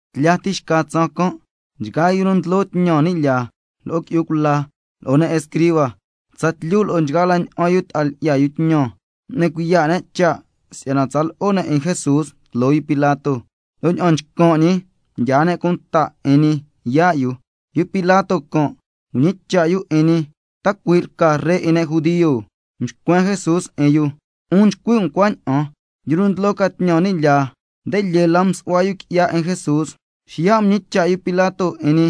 Tlya ti xca tsaan can' nchgaa yu nu ndlo tñan ni' lyaa, lo'o qui'yu cula, lo'o ne' escriba, tsatlyu lo'o nchgaa la ña'an yu ta'a lyi'ya yu tñan, m'ni cuiya' ne' cha' si'yana tsa lo'o ne' 'in Jesús tloo Pilato, lo' ña'an nchcan' ñi mdyaa ne' cunta 'in ñi yaa' yu. Yu Pilato can' mñicha' yu 'in ñi: ¿Ta cui' lca Ree 'in ne' judio? Mxcuen Jesús 'in yu: 'Un nchcui' um cuaña'an. Yu nu ndlo ca tñan ni' lyaa, nde lyee la msu'hua yu qui'ya 'in Jesús. Xiya' mñicha' yu Pilato 'in ñi: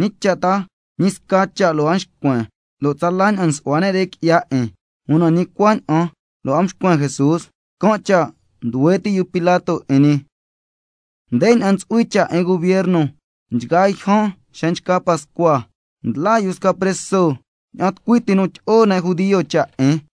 ¿Ñi cha' ta ñi sca cha' lo' a xcuen, lo' tsala ña'an nsu'hua ne' re qui'ya 'in? Una ñi cuaña'an lo' a mxcuen Jesús, can' cha' nduhue ti' yu Pilato 'in ñi. Ndeña'an ntsu'hui cha' 'in gubierno nchgaa yjan xa nchca Pascua, ndlaa yu sca preso, ña'an tucui ti nu ndyi'o ne' judio cha' 'in.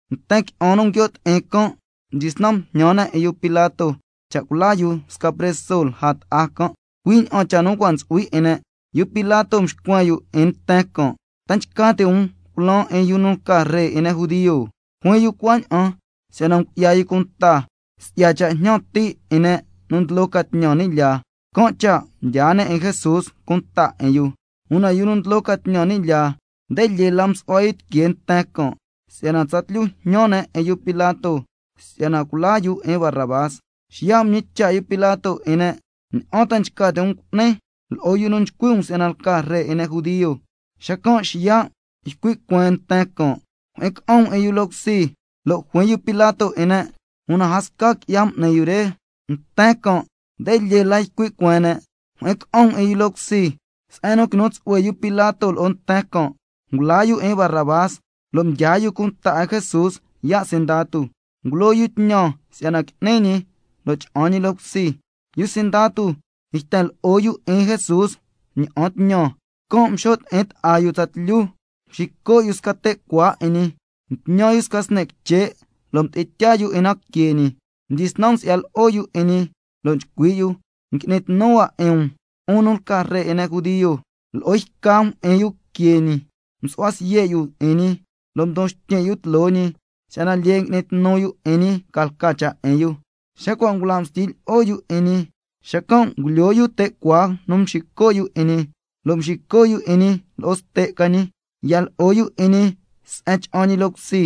Nten qui'an nu nguio' ti'in can', mdyisnan mjñan ne' 'in yu Pilato cha' culaa yu sca preso lja ta'a can', cui' ña'an cha' nu cua' ntsu'hui 'in yu. Yu Pilato mxcuen yu 'in nten can': ¿Ta nchca ti' um culaan 'in yu nu lca ree 'in ne' judio? Juin yu cuaña'an, si'yana ngu'ya yu cunta si'ya cha' jñan ti' 'in ne' nu ndlo ca tñan ni' lyaa, can' cha' mdyaa ne' 'in Jesús cunta 'in yu. Una yu nu ndlo ca tñan ni' lyaa, nde lyee la msu'hua yu tiquee nten can', si'yana tsatlyu jñan ne' 'in yu Pilato si'yana culaa yu 'in Barrabás. Xiya' mñicha' yu Pilato 'in ne': ¿Ña'an ta nchca ti' um cu'nin, lo'o yu nu nchcui' um si'yana lca ree 'in ne' judio? Xacan' xiya' ycui' cueen nten can': Jyi'in ca'an um 'in yu loo cusi. Lo' juin yu Pilato 'in ne': Una a sca qui'ya m'ni yu re. Nten can' nde lyee la ycui' cueen ne': Jyi'in ca'an um 'in yu loo cusi. Se'en nu quinu tsu'hue yu Pilato lo'o nten can', ngulaa yu 'in Barrabás, lo' mdyaa yu cunta 'in Jesús yaa' sindatu, ngulo yu tñan si'yana qui'ni ñi, lo' cha'an ñi loo cusi. Yu sindatu yten lo'o yu 'in Jesús ña'an tñan, can' mxo' ti'in ta'a yu tsatlyu. Mxico' yu sca te' cuaa 'in ñi, mtñan yu sca sni' quiche' lo' mdi'in tyaa yu 'in na que ñi. Mdyisnan msi'ya lo'o yu 'in ñi, lo' nchcui' yu: ¡Ngui'ni tnu hua 'in um, 'un nu lca ree 'in ne' judio! Lo'o yca mjyi'in yu que ñi, msu'hua siye' yu 'in ñi, lo' mdon xtyin' yu tloo ñi, si'yana lyee ngui'ni tnu yu 'in ñi ca lca cha' 'in yu. Xa cua' ngula' mstyi lyi'o yu 'in ñi, xacan' ngulyoo yu te' cuaa nu mxico' yu 'in ñi, lo' mxico' yu 'in ñi lo'o ste' ca ñi. Ya lo'o yu 'in ñi se'en cha'an ñi loo cusi.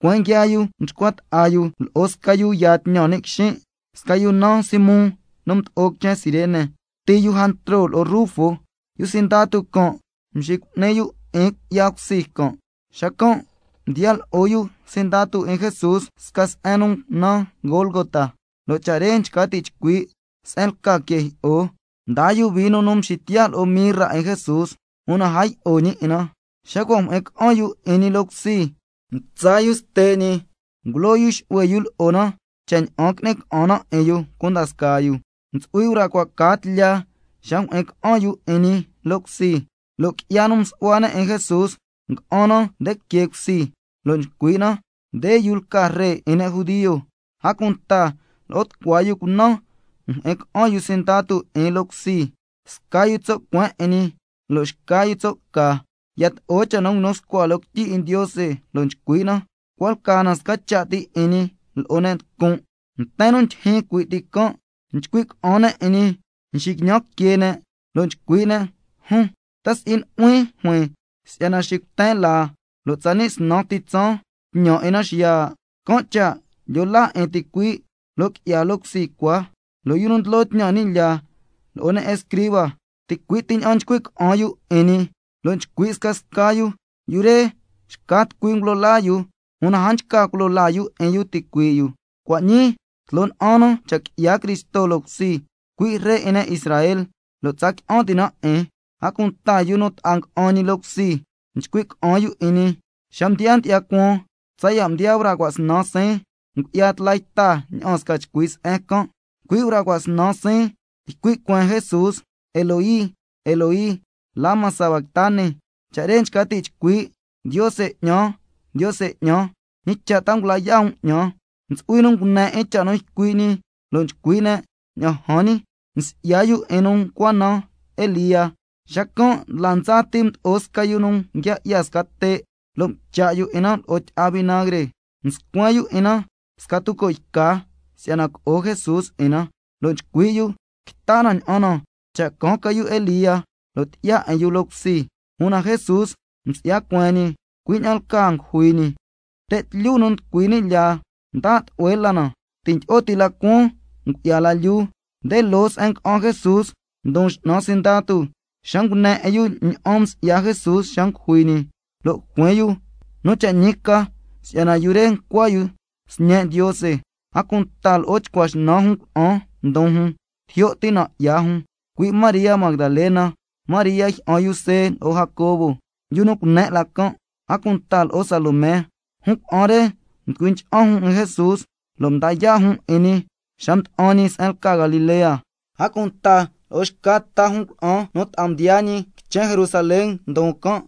Tucueen nguiaa yu mchcua ta'a yu lo'o sca yu yaa tñan ni' quixin', sca yu naan Simón nu mdo'o quichen Cirene, sti yu Jantro lo'o Rufo, lo' yu sindatu can' mxicu'ni yu 'in cui'ya cusi can'. Xacan' mdiya lo'o yu sindatu 'in Jesús sca se'en nu naan Gólgota, lo' cha' re nchca ti' chcui', se'en lca que jyi'o. Mdaa yu vino nu mxitiya' lo'o mirra 'in Jesús, una a yi'o ñi 'in na. Xa cua' mjyi'in ca'an yu 'in ñi loo cusi, mtsa yu ste' ñi, ngulo yu xu'hue yu lo'o na, cha' ña'an qui'ni ca'an na 'in yu cunda scaa yu. Ntsu'hui braa cua' caa tlya xa mjyi'in ca'an yu 'in ñi loo cusi. Lo' qui'ya nu msu'hua ne' 'in Jesús nga'an na nde que cusi, lo' nchcui' na: Nde yu lca ree 'in ne' judio. A cunta lo'o tucua yu cunan mjyi'in ca'an yu sindatu 'in loo cusi, sca yu tso' cueen 'in ñi, lo' xca yu tso' ca. Yato'o cha' nu nguinu scua loo quityi 'in Ndiose, lo' nchcui' na: Cua' lca na sca cha' ti 'in ñi lo'o ne' nducun'. Nten nu ndyijyin cui' ti can' nchcui' ca'an ne' 'in ñi, nxiquiñan ne' que ne' lo' nchcui' ne': Jun', ¿ta si'i nu'huin juin si'yana xicuten laa, lo' tsani' snan ti tsaan tñan 'in na xiya'? Can' cha' lyo laa 'in ticuii', lo' qui'ya loo cusi cua. Yu nu ndlo tñan ni' lyaa lo'o ne' escriba, ticui' ti ña'an nchcui' ca'an yu 'in ñi, lo' nchcui' scasca yu: Yu re, xca tucui ngulo laa yu, una a nchca culo laa yu 'in yu ticuii' yu. Cua' ñii tloo na'an na cha' qui'ya Cristo loo cusi, cui' ree 'in ne' Israel, lo' tsa qui'an ti' na 'in. A cunta yu nu ta'a nga'an ñi loo cusi, nchcui' ca'an yu 'in ñi. Xa mdiyaa ndyi'ya cuaan tsaya' mdiyaa braa cua' snan siin, ngu'ya tla yta ña'aan sca chcui se'en can'. Cui' braa cua' snan siin ycui' cueen Jesús: —Eloi, Eloi, ¿lama sabactani—? Cha' re nchca ti' chcui': —Ndiose 'ñan, Ndiose 'ñan, ¿ñi cha' ta ngula yaa' um 'ñan—? Ntsu'hui nu ngune 'in cha' nu ycui' ñi, lo' nchcui' ne': Ña'an jan ñi, nsi'ya yu 'in nu ncua naan Elía. Xacan' ndla ndsa ti mdo'o sca yu nu nguia 'ya sca te', lo' mcha' yu 'in na lo'o tyi'a vinagre, mscuen yu 'in na sca tuco' yca si'yana co'o Jesús 'in na, lo' nchcui' yu: Quita na ña'an na cha' caan ca yu Elía, lo' tyi'ya 'in yu loo cusi. Una Jesús msi'ya cueen ñi, cui' ña'an lcaa ngujui ñi. Te' tlyu nu nducui ni' lyaa mda' tlu'hue la na, ti' ndyi'o la cuaan ngu'ya la lyuu. Nde loo se'en nga'an Jesús ndon x'nan sindatu, xa ngune 'in yu ña'an msi'ya Jesús xa ngujui ñi, lo' juin yu: Nu cha' ñi ca si'yana yu re ncua yu Sñe' Ndiose. A cunta lo'o tucua snan jun cuna'an ndon jun tijyo' ti nan' 'ya jun, cui' María Magdalena, María jyi'an yu See lo'o Jacobo, yu nu cune' la can', a cunta lo'o Salomé. Jun cuna'an re mducui ncha'an jun 'in Jesús, lo' mdaa yaa' jun 'in ñi xa mda'an ñi se'en lca Galilea. A cunta lo'o xca ta jun cuna'an nu ta'a mdiyaa ñi quichen Jerusalén, ndon can'.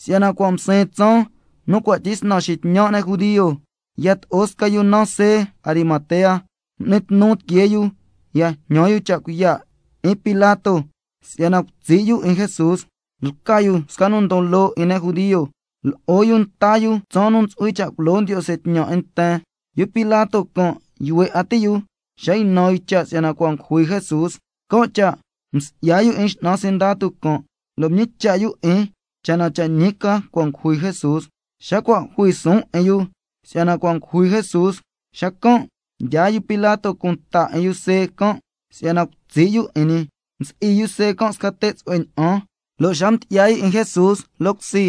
Si'yana cua' msiin tsaan nu cua' tyisnan xitñan' ne' judio, yato'o sca yu naan See Arimatea, m'ni tnu tiquee yu ya jñan yu cha' cuiya' 'in Pilato si'yana cutsi' yu 'in Jesús. Lca yu sca nu ndon loo 'in ne' judio, lo'o yu nta yu tsaan nu ntsu'hui cha' culo Ndiose tñan 'in nten. Yu Pilato can' yuhue 'a ti' yu xa ynan yu cha' si'yana cua' ngujui Jesús, can' cha' msi'ya yu 'in x'nan sindatu can', lo' mñicha' yu 'in cha' na cha' ñi ca cua' ngujui Jesús. Xa cua' jui suun 'in yu si'yana cua' ngujui Jesús, xacan' mdyaa yu Pilato cunta 'in yu See can' si'yana cutsi' yu 'in ñi. Msi'i yu See can' sca te' tsu'hue ña'an, lo' xa mdyi'ya yu 'in Jesús loo cusi,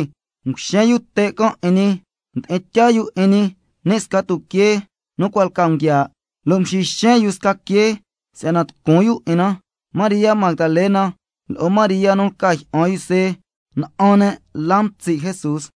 nguxen yu te' can' 'in ñi. Mdi'in tyaa yu 'in ñi ni' sca tuquee nu cua' lca nguiaa', lo' mxixen yu sca quee si'yana tucun yu 'in na. María Magdalena, lo'o María nu lca jyi'an yu See, na'an ne' la mtsi' Jesús.